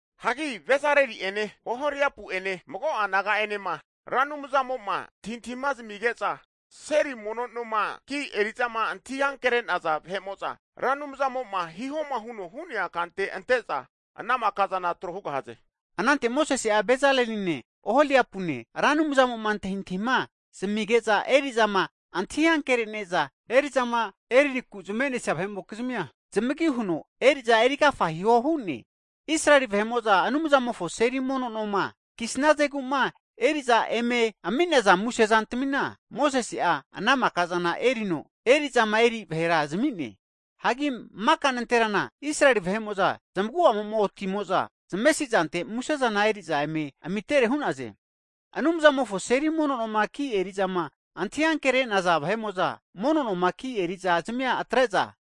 Hagi Bezaleli'ene Oholiapu ene mago'a naga'enema Ra Anumzamo'ma antahintahima zamige'za seli mono noma ki' eri'zama antahi ankere'naza vahe'mo'za, Ra Anumzamo'ma hihoma huno hu'nea kante ante'za ana maka zana tro hugahaze. Anante Mosese'a Bezaleline Oholiapune Ra Anumzamo'ma antahintahima zamige'za eri'zama antahi ankere'ne'za eri'zama eriku zame'nesia vahe'mokizmia zamagi huno eri'za erigafa hiho hu'ne. Israeli vahe'mo'za Anumzamofo seli mono noma kisnazegu'ma eri'za eme ami'naza muse zantamina, Mosese'a ana maka'zana erino eri'zama eri vahera zami'ne. Hagi maka nanterana Israeli vahe'mo'za zmagu'amo'ma otimo'za zamesi zante musezana eri'za eme amitere hu'naze. Anumzamofo seli mono noma ki eri'zama antahi ankere'naza vahe'mo'za mono noma ki eri'za zamia atre'za,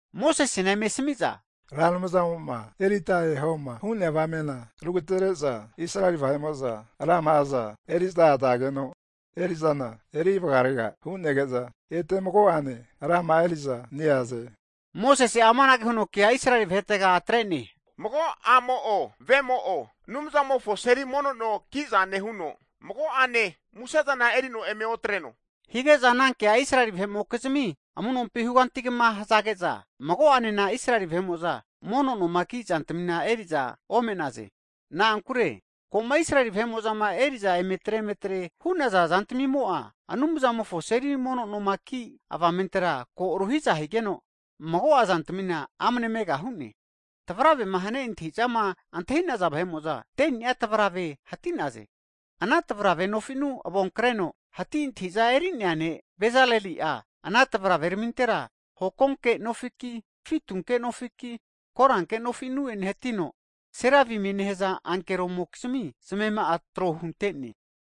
Mosesena eme asami'za, Ra Anumzamo'ma erita ehoma hu'nea avamena rugatere'za Israeli vahe'mo'za rama'aza eri'za azageno eri'zana eri vagarega hu'nege'za, ete mago'ane rama'a eri'za neaze. Mosese'a amanage huno kea Israeli vahetega atre'ne, mago a'mo'o vemo'o Anumzamofo seli mono no ki'zane huno mago'ane musezana erino eme otreno, hige'za anankea Israeli vahe'mokizmi amu'nompi hugantigama hazage'za, mago'anena Israeli vahe'mo'za mono noma ki zantamina eri'za ome'naze. Na'ankure, ko'ma Israeli vahe'mo'zama eri'za emetre emetre hu'naza zantamimo'a Anumzamofo seli mono noma ki' avamentera ko agateregeno, mago'a zantamina amne mega hu'ne. Tavravema hane antahi'zama antahi'naza vahe'mo'za 10ni'a tavrave hati'naze. Ana tavrave nofi'nu avonkreno hati antahi'za eri'nea ne' Bezaleli'a ana tavraveramintera hokonke nofiki, fitunke nofiki, koranke nofinu'ene hatino seravimie nehaza ankeromokizmi zmema'a tro hunte'ne.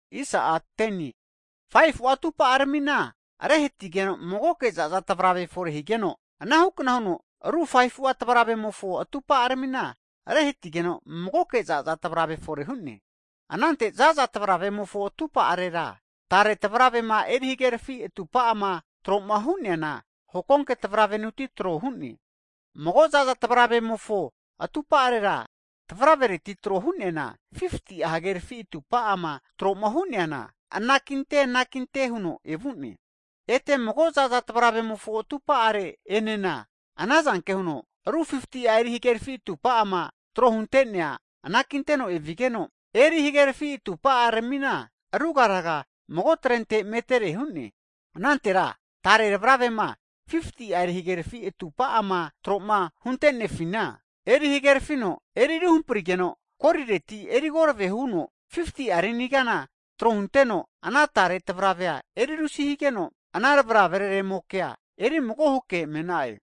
Hagi 5fu'a atupa'aramina rehatigeno, magoke za'za tavrave fore higeno, anahukna huno ru 5fu'a tavravemofo atupa'aramina rehatigeno, magoke za'za tavrave fore hu'ne. Anante ana za'za tavravereremofo tupa'arera tare tavravere'ma eri hagerafi atupa'ama tro'ma hu'neana hokonke tavravenuti tro hu'ne. Mago za'za tavravemofo atupa'arera tavravereti tro hu'neana 50'a hagerafi atupa'ama tro'ma hu'neana, anakinte anakinte huno evu'ne. Ete mago zaza tavravemofo atupa'are enena ana zanke huno ru 50'a eri hagerfi atupa'ama tro hunte'nea anakinteno evigeno eri hagerafi atupa'aramina, rugaraga mago trente metere hu'ne. Anantera tare tavravere'ma 50'a eri hagerafi atupa'ama tro'ma huntenefina, eri hagerafino eri ruhamprigeno, golireti eri korave huno 50'a rini kana tro huteno, ana tare tavravea eri rusi higeno, ana tavraveraremokea erimago huke me'na'e.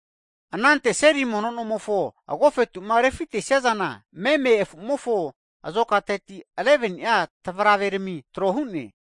Anante seli mono nomofo agofetu'ma refitesia zana, meme afu'mofo azokateti 11ni'a tavraverami tro hu'ne.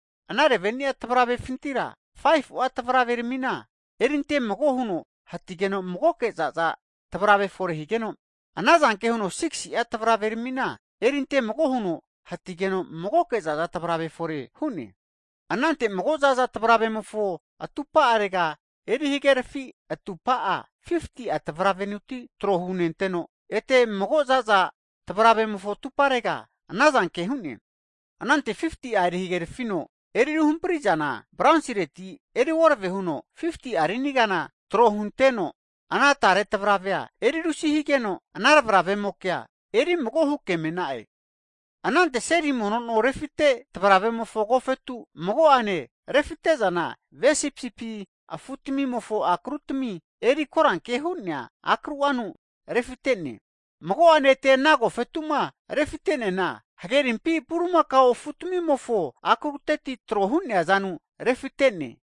Ana 11ni'a tavravefintira 5fu'a tavraveramina erinte mago huno hatigeno magoke za'za tavrave fore higeno, ana zanke huno 6si'a tavraveramina erinte mago huno hatigeno magoke za'za tavrave fore hu'ne. Anante mago za'za tavravemofo atupa'arega eri hagerafi atumpa'a 50'a tavravereti trohu nenteno, ete mago za'za tavravemofo atumparega ana zanke hu'ne. Anante 50'a eri hagerafino eri ruhampri'zana bronsireti eri korave huno 50'a rini kana tro huteno, ana tare tavravea eri rusi higeno ana tavraveraremokea erimago huke me'na'e. Anante seli mono no refite tavravemofo agofetu mago'ane refite'zana ve sipisipi afutamimofo akrutami eri koranke hu'nea akru'anu refite'ne. Mago'ane ete ana agofetu'ma refite'neana hagerimpi bulimakao afutamimofo akruteti tro hu'nea zanu refite'ne.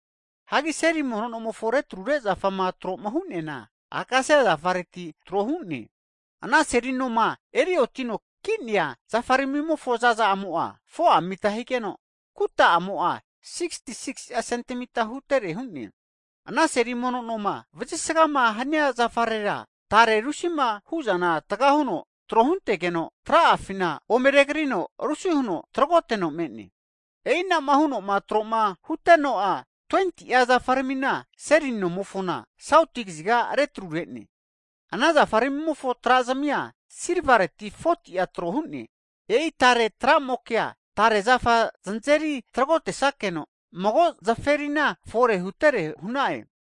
Hagi seli mono nomofo retrure zafama tro'ma hu'neana, akasia zafareti tro hu'ne. Ana seli noma eri otino ki'nea zafaramimofo zaza'amo'a, 4'a mita higeno, kahesa'amo'a 66si'a sentimita hutere hu'ne. Ana seli mono noma vazisgama hania zafarera, tare rusima hu'zana taga huno tro huntegeno, tra'afina ome regrino rusi huno tragoteno me'ne. E'i anama huno'ma tro'ma huteno'a 20'a zafaramina seli nomofona sauti kaziga retrure'ne. Ana zafarmimofo tra'azmia silvareti 40'a tro hu'ne. E'i tare tra'mokea tare zafa znazeri tragotesakeno mago nozaferina fore hutere hu'na'e.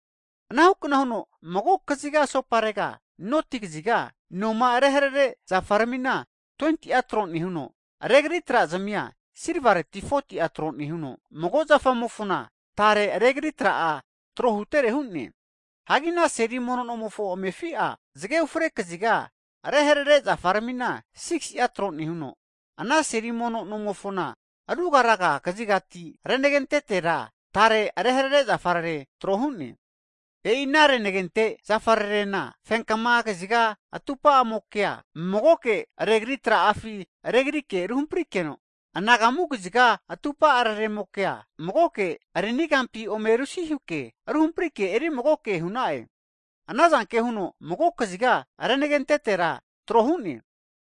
Ana hukna huno mago kaziga asoparega noti kaziga noma reharere zafaramina 20'a tro nehuno, regri tra'zmia silvareti 40'a tro nehuno, mago zafamofona tare regri tra'a tro huntetere hu'ne. Hagi ana seli mono nomofo amefi'a zage ufre kaziga reharere zafaramina 6si'a tro nehuno, ana seli mono nomofona rugaraga kazigati renagentetera tare reharere zafarere tro hu'ne. E'i ana renagente zafarerena, fenkama kaziga atupamokea magoke regri tra'afi regrike ruhamprikeno, anagamu kaziga atupa'araremokea magoke rini kampi ome rusihuke ruhaprike eri magoke hu'na'e. Anazanke huno mago kaziga renagetetera tro hu'ne.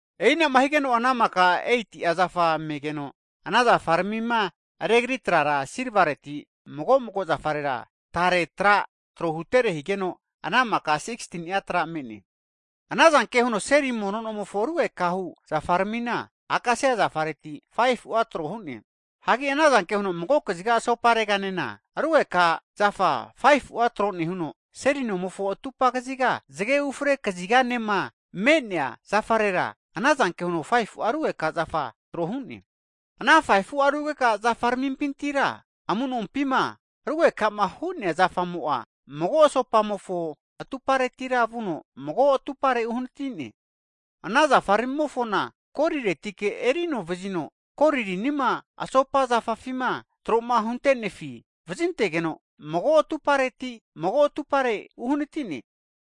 E'inama higeno'a ana makara 8'a zafa megeno ana zafaramima regri trara silvareti mago'mago zafarera tare tra trohutere higeno, ana makara 16ni'a tra me'ne. Ana zanke huno seli mono nomofo rugekahu zafaramina, akasia zafareti 5fu'a tro hu'ne. Hagi ana zanke huno mago kaziga asopareganena (saut) rugeka zafa 5fu'a tro nehuno, seli mono nomofo atupa kaziga zage fre kaziganema (west) me'nea zafarera ana zanke huno 5fu'a rugeka zafa tro hu'ne. Ana 5fu'a rugeka zafaramimpintira amu'nompima rugeka'ma hu'nea zafamo'a, mago asopamofo atuparetira vuno, mago atupare uhanitine. Ana zafaramimofona goliletike erino nevazino, goli rinima asopa zafafima tro'ma hunte'nenefi vazintegeno, mago atupareti mago atupare uhanatine.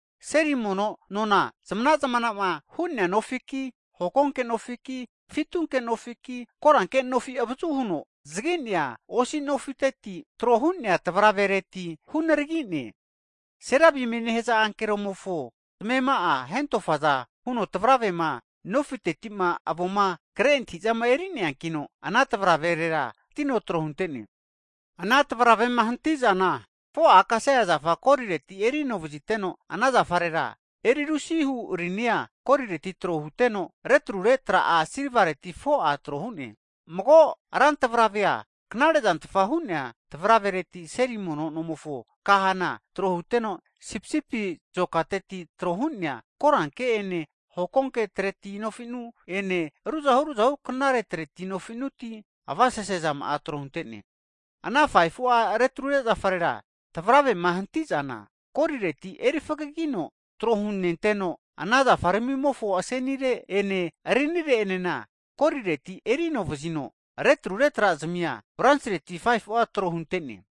Seri mono nona zamana zamana'ma hu'nea nofiki, hokonke nofiki, fitunke nofiki, koranke nofi avazu huno zagi'nea osi nofiteti tro hu'nea tavravereti hunaragi'ne. Serabimie nehaza ankeroramimofo zmema'a hentofaza huno tavravere'ma nofiteti'ma avoma kre antahi'zana eri'neankino ana tavraverera hatino tro hunte'ne. Ana tavravema hanti'zana, 4'a akasia zafa golireti eri ano vaziteno, ana zafarera eri rusihu rini'a golireti tro huteno, retrure tra'a silvaleti 4'a tro hu'ne. Mago rantavravea knare'zantfa hu'nea tavravereti seli mono nomofo kahana tro huteno sipisipi zokateti tro hu'nea koranke ene hokonke treti nofi'nuti ene ruzahu ruzahu knare treti nofi'nuti avasese zama'a tro hunte'ne. Ana 5fu'a retrure zafarera tavravema hanti'zana golireti eri fagigino tro hunenteno, ana zafaramimofo asenire ene rinire'enena golireti eri ano nevazino, retrure tra'zamia bronsireti 5fu'a tro hunte'ne.